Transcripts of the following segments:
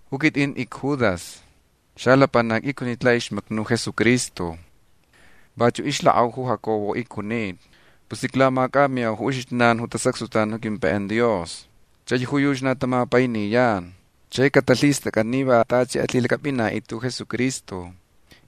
Ju quitʼin icJudas. Xalapanac icjunita laʼixmacni ju Jesucristo. Vachuʼ ixlakʼau ju Jacobo icjunita. Pus iclamacʼamiyau ju uxijnan ju tasacxtutan ju quimpaiʼan Dios. Chai ju yuchi na tamapainiyan. Chai catalhistʼacʼan ni va tachi alhilacʼapʼinaʼitʼit ju Jesucristo.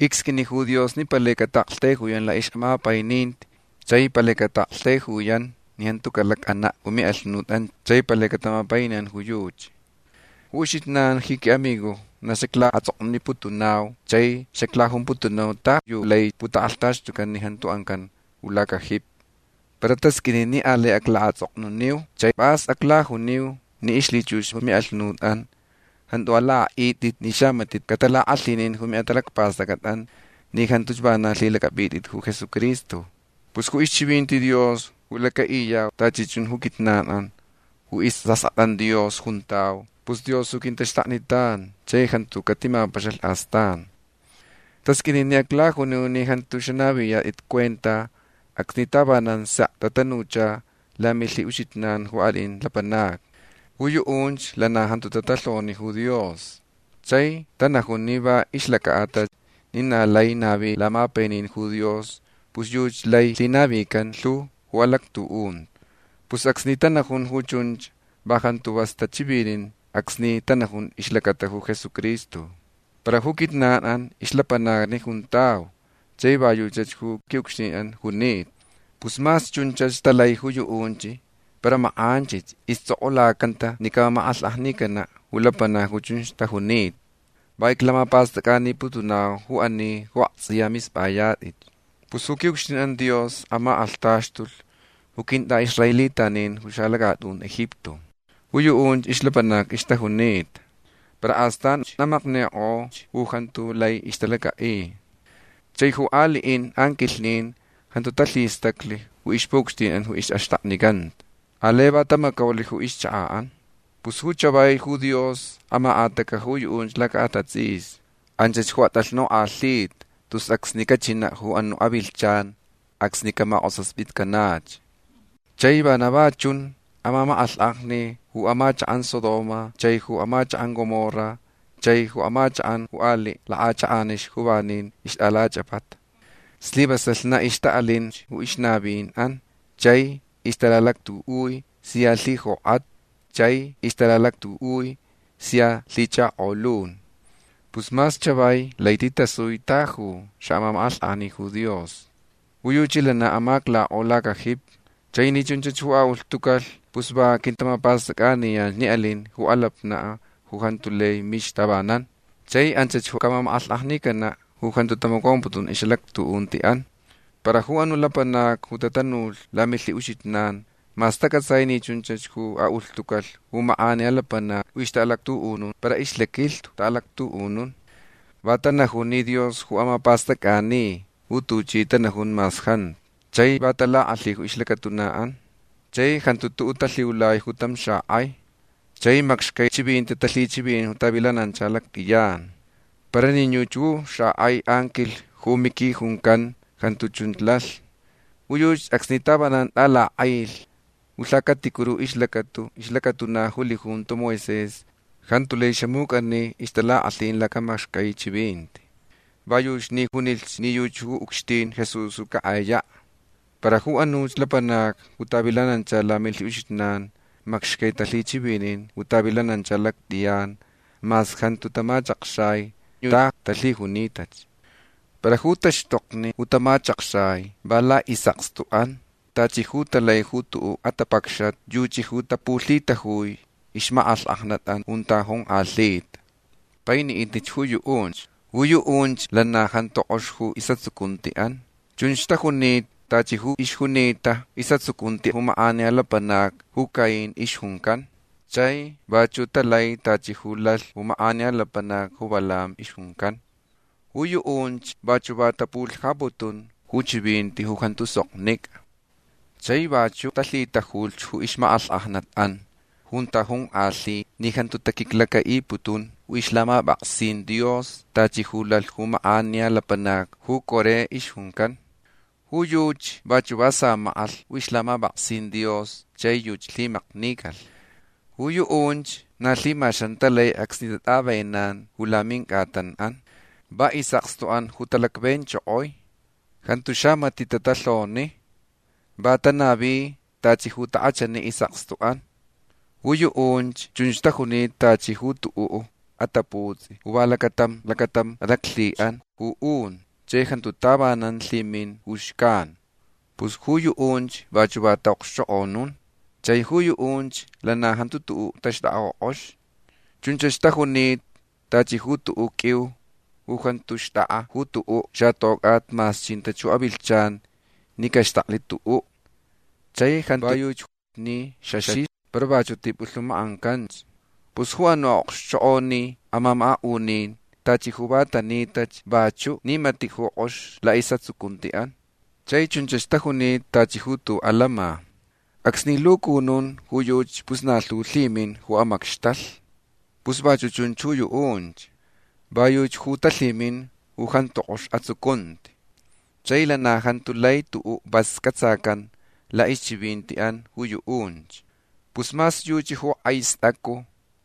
Icsqʼuini ju Dios ni palai cataʼaktaijuyan laʼixʼamapaininti chai palai cataʼaktaijuyan ni jantu calacʼanaʼ ju miʼalhunutʼan chai palai catamapainiyan ju yuchi. Ju uxijnan ji quiʼamigojni na xaclaʼatsʼoknuniputunau chai xaclajumputunau ta yu lai putakʼalhtaxtucan ni jantu ancan ju lacajipi. Para tasqʼuini ni alai aclaʼatsʼoknuniu chai pʼas aclajuniu ni ixlhichux ju miʼalhunutʼan jantu alakʼaʼitʼit ni xamatiʼ catalakʼalhinin ju miʼatalacpastʼacʼatʼan ni jantuch vana alhilacʼapʼitʼit ju Jesucristo. Pus ju ixchivinti Dios ju lacaʼiyau tachi chun ju quijnanʼan ju isʼaskʼatʼan Dios juntau pus Dios ju quintaxtaknitan chai jantu catimapaxalh astan. Tasqʼuini ni aclajuniu ni jantu xanaviyatʼit cuenta acsni tavanan sek tatanucha lamilhiʼuxijnan ju aliʼin lapanacni. Ju yuʼunch lana jantu tatalhoni ju Dios. Chai tanajun ni va ixlacaʼatalh ni na lai navi lamapainin ju Dios pus yuchi lai lhinavican lhu ju alactuʼunti. Pus acsni tanajun ju chunch va jantu vas tachivinin acsni tanajun ixlacata ju Jesucristo. Para ju quijnanʼan ixlapanacni juntau chai va yuchach ju quiʼucxtinʼan junita. Pus mas chunch talai ju yuʼunch para makʼanchich istsʼokʼulacanta ni camamakʼalhkʼajnicanaʼ ju lapanacni ju chunch tajunita. Va iclamapastʼacʼaniputunau ju ani ju aktsʼiya mispʼayatʼitch. Pus ju quiʼucxtinʼan Dios amakʼalhtaxtulh ju quintʼaʼisraelitanin ju xalacatʼun Egipto. Ju yuʼunch ixlapanacni ixtajunita. Para astanch amaknikʼolhch ju jantu lai ixtalacaʼi. Chai ju aliʼin anquilhnin jantu talhistaclh ju ixpuʼucxtinʼan ju ixʼaxtaknicanta. Alai va tamacaulh ju ixchakaʼan. Pus ju chavai ju Dios amakʼatacaʼ ju yuʼunch lacaʼatatsʼisni. Anch ju atʼalhnukʼalhita tus acsni cachinaʼ ju anuʼ avilhchan acsni camakʼosaspitcanach. Chai vana va chunch amamakʼalhkʼajni ju amachakʼan Sodoma chai ju amachakʼan Gomorra chaich ju amachakʼan ju aliʼ lakʼachakʼanixni ju vanin ixtʼalachʼapata. Slivasalh na ixtaʼalinch ju ixnavinʼan chai ixtalalactuʼui sia lhijokʼat chai ixtalalactuʼui sia lhichakolun. Pus mas chavai lai titasui ta yu xaʼamamakʼalhkʼajni ju Dios. Ju yuchi lana amaclakʼo lacajipi. Chai ni chunch ju aʼulhtucalh pus va quintamapastʼacʼaniyan ni alin ju alapnaʼ ju jantu lai mixa tavanan. Chai anch ju camamakʼalhkʼajnicanaʼ ju jantu tamacomputun ixʼalactuʼuntiʼan. Para ju anuʼ lapanacni ju tatanulh lamilhiʼuxijnan mas tacʼatsai ni chunch ju aʼulhtucalh ju makʼaniya lapanacni ju ixtaʼalactuʼunun para ixlaquilhtu taʼalactuʼunun. Va tanajun ni Dios ju amapastʼacʼani ju tuchi tanajun mas jantu. Chai va talakʼalhi ju ixlacatunaʼan. Chai jantu tuʼuʼ talhiulai ju tam xakʼai. Chai macxcai chivinti talhichivinin ju tavilanancha lactʼiyan. Para nin yuchi ju xakʼai anquilh ju Miqui juncan jantu chun lalh. Ju yuchi acsni tavanan tʼalakʼailh ju lhacaticuru ixlacata ixlacatuna ju lijunto Moisés jantu lai xamucʼani ixtalakʼalhin lacamacxcai chivinti. Va yuchi ni junilh ni yuchi ju ucxtin Jesús ju cakʼayaʼ. Para ju anuch lapanacni ju tavilanancha lamilhiʼuxijnan macxcai talhichivinin ju tavilanancha lactʼiyan mas jantu tamachakxai ta yu talhijunitach. Para ju taxtokni ju tamachakxai va laʼisʼakstuʼan tachi ju talai ju tuʼuʼ atapacxat yuchi ju tapulhitajui ixmakʼalhkʼajnatʼan junta jonkʼalhita. Painiʼitnich ju yuʼunch. Ju yuʼunch lana jantu kʼox ju isʼatsucuntiʼan. Chunch tajunita tachi ju ixjunita ju isʼatsucunti ju makʼaniya lapanac ju Caín ixjuncan. Chai vachuʼ talai tachi ju lalh ju makʼaniya lapanac ju Balaam ixjuncan. Ju yuʼunch vachuʼ va tapulhajaputun ju chivinti ju jantu soknicʼa. Chai vachuʼ talhitajulh ju ixmakʼalhkʼajnatʼan junta jonkʼalhita ni jantu taquiclacaʼiputun ju ixlhamapʼaksin Dios tachi ju lalh ju makʼaniya lapanac ju Coré ixjuncan. Ju yuchi vachuʼ va samakʼalh ju ixlhamapʼaksin Dios chai yuchi lhimaknicalh. Ju yuʼunch na lhimaxan talai acsni tatʼavenan ju lamincʼatanʼan. Va isʼakstuʼan ju talacvenchokoi. Jantu xamatiʼ tatalhoni. Va tanavi tachi ju takʼachani isʼakstuʼan. Ju yuʼunch chunch tajunita tachi ju tuʼuʼ ataputsʼi ju va lacatam lacatam alaclhiʼanch ju un chai jantu tavanan lhimin ju xcan. Pus ju yuʼunch vachuʼ va taʼaʼokxchokʼonun. Chai ju yuʼunch lana jantu tuʼuʼ taxtʼakʼa ju kʼox. Chunch tajunita tachi ju tuʼuʼ qʼuiu ju jantu xtʼakʼa ju tuʼuʼ xatocʼat mas chinta ju avilhchan ni caxtaklh tuʼuʼ. Chai jantu va yuchi ni xaxixa para vachuʼ tipulhumakʼancanch. Pus ju anuʼ aʼokxchokʼoni amamakaʼunin tachi ju va tanitach vachuʼ ni matiʼ ju kʼox laʼisʼatsucuntiʼan. Chai chunch tajunita tachi ju tuʼuʼ alama. Acsni lucunun ju yuchi pus na lhu lhimin ju amacxtalh. Pus vachuʼ chunch ju yuʼunch. Va yuchi ju talhimin ju jantu kʼox atsucunti. Chai lana jantu lai tuʼuʼ vas cʼatsacan laʼixchivintiʼan ju yuʼunch. Pus mas yuchi ju kʼai stʼacu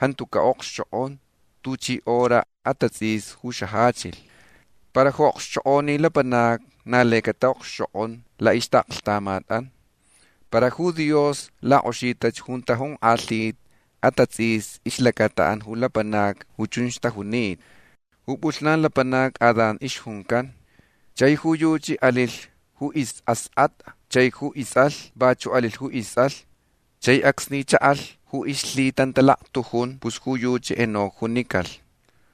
jantu caʼokxchokʼon tuchi horach atatsʼisni ju xajachilh. Para ju aʼokxchokʼoni lapanacni na lai cataʼokxchokʼon laʼixtaʼaklhtamatʼan. Para ju Dios lakʼoxita junta jonkʼalhita atatsʼisni ixlacataʼan ju lapanacni ju chunch tajunita. Ju pʼulhnan lapanac Adán ixjuncan. Chai ju yuchi alilh ju isʼaskʼatʼa chai ju istsʼalh vachuʼ alilh ju istsʼalh. Chai acsni chaʼalh ju ixlhitantalaktujun pus ju yuchi Enoc junicalh.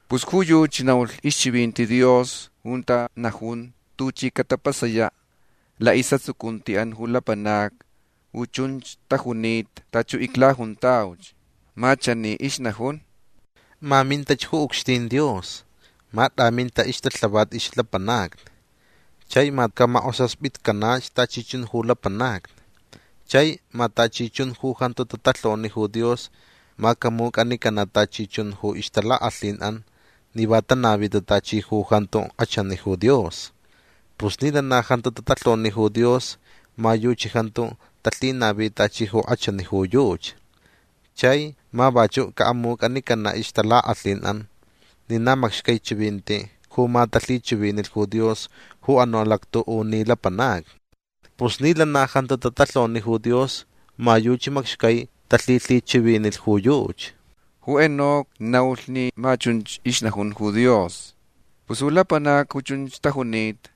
Pus ju yuchi naulh ixchivinti Dios junta najun tuchi catapasayaʼ laʼisʼatsucuntiʼan ju lapanacni ju chunch tajunita tachi ju iclajuntauch. Ma chani ixnajunch: “Ma mintach ju ucxtin Dios. Ma tʼaminta ixtalhavat ixlapanacni. Chai ma camakʼosaspitcanach tachi chun ju lapanacni. Chai ma tachi chun ju jantu tatalhoni ju Dios ma camucʼanicanaʼ tachi chun ju ixtalakʼalhinʼan ni va tanavita tachi ju jantu kʼachani ju Dios. Pus ni lana jantu tatalhoni ju Dios ma yuchi jantu talhinavi tachi ju kʼachani ju yuchi. Chai ma vachuʼ caʼamucʼanicanaʼ ixtalakʼalhinʼan ni na macxcai chivinti ju ma talhichivinilh ju Dios ju anuʼ alactuʼuni lapanacni. Pus ni lana jantu tatalhoni ju Dios ma yuchi macxcai talhilhichivinilh ju yuchi”. Ju Enoc naulh ni ma chunch ixnajun ju Dios. Pus ju lapanacni ju chunch tajunita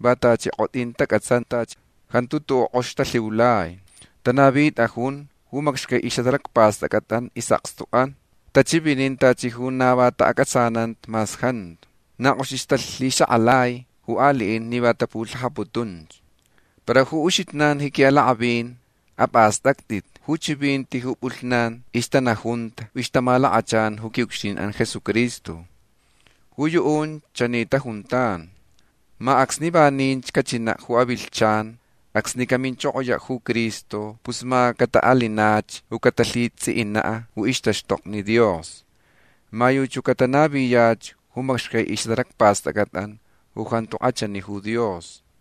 va tachi kʼotʼin tacʼatsantach. Jantu tuʼuʼ kʼox talhiulai. Tanavitʼajun ju macxcai ixʼatalacpastʼacʼatʼan isʼakstuʼan. Tachivinin tachi ju na va taʼacʼatsananta mas jantu. Na kʼoxich talhixakʼalai ju aliʼin ni va tapulhajaputun. Para uxijnan ji quiʼalakʼavin apʼastʼactʼit ju chivinti ju pʼulhnan ixtanajunta ju ixtamalakachan ju quiʼucxtinʼan Jesucristo. Ju yuʼunch chani tajuntan: “Ma acsni vaninch cachinaʼ ju avilhchan acsni caminchokoyaʼ ju Cristo pus ma cataʼalinach ju catalhitsʼiʼinaʼ ju ixtaxtokni Dios. Ma yuchach ju catanaviyach ju macxcai ixʼatalacpastʼacʼatʼan ju jantu kʼachani ju Dios.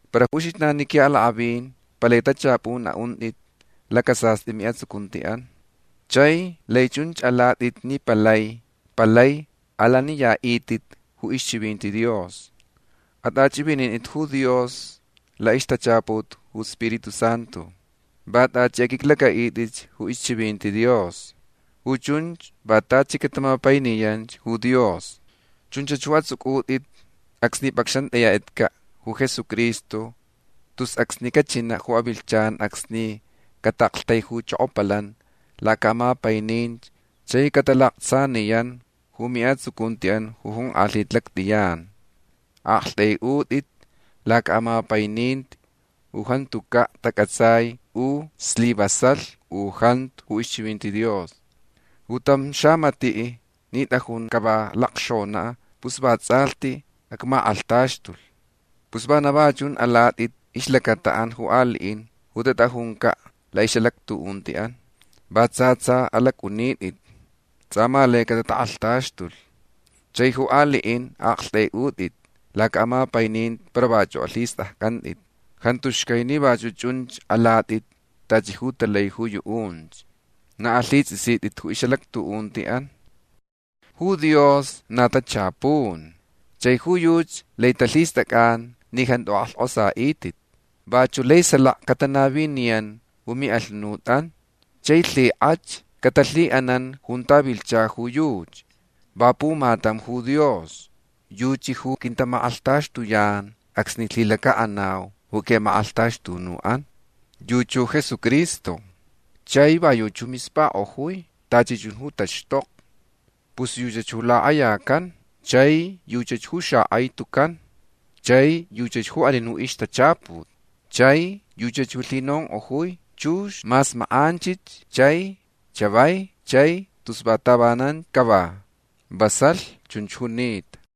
Para uxijnan ji quiʼalakʼavin palai tachapun aʼuntʼit lacasastʼi miʼatsucuntiʼan. Chai lai chunch alatʼit ni palai palai alaniyaʼitʼit ju ixchivinti Dios. Atʼachʼivinintʼit ju Dios laʼixtachaput ju Spiritu Santu. Va tachi aqʼuiclacʼaʼitʼit ju ixchivinti Dios. Ju chunch va tachi catamapainiyan ju Dios. Chunchach ju atsʼucʼutʼit acsni pʼacxantʼayatʼitcaʼ ju Jesucristo tus acsni cachinaʼ ju avilhchan acsni cataʼaktaijuchokopalan lacaʼamapaininti chai catalaktsaniyan ju miʼatsucuntiʼan ju jonkʼalhita lactʼiyan. Aʼaktʼaiʼutʼit lacaʼamapaininti ju jantucaʼ tacʼatsai u slivasalh u jantu ju ixchivinti Dios. Ju tam xamatiʼ ni tʼajunch cava lakxonaʼ pus vatsʼalhtich acmakʼalhtaxtulh. Pus vana va chun alatʼit ixlacataʼan ju aliʼin ju tatʼajuncaʼ laʼixʼalactuʼuntiʼan. Va tsa tsa alacʼunitʼitch. Tsʼa ma laich catatakʼalhtaxtulh. Chai ju aliʼin aʼaktʼaiʼutʼit lacaʼamapaininti para vachuʼ alhistʼaccʼantʼit. Jantu xcai ni vachuʼ chunch alatʼit tachi ju talai ju yuʼunch. Na alhitsʼisitʼit ju ixʼalactuʼuntiʼan. Ju Dios na tachapun. Chai ju yuchi lai talhistʼacʼan ni jantu akʼalhkʼosaʼitʼit. Vachuʼ lai salaka catanaviniyan ju miʼalhunutʼan. Chai lhikʼach catalhiʼanan junta vilhcha ju yuchi. Va pumatam ju Dios. Yuchi ju quintamakʼalhtaxtuyan acsni lhilacaʼanau ju quiʼamakʼalhtaxtunuʼan. Yuchi ju Jesucristo. Chai va yuchi ju mispakʼojui tachi chun ju taxtokni. Pus yuchach ju lakʼayacan. Chai yuchach ju xakʼai tucan. Chai yuchach ju alin ju ixtachaput. Chai yuchach ju lhinonkʼojui chux mas makʼanchich chai chavai chai tus va tavanan cava. Vasalh chunch junita.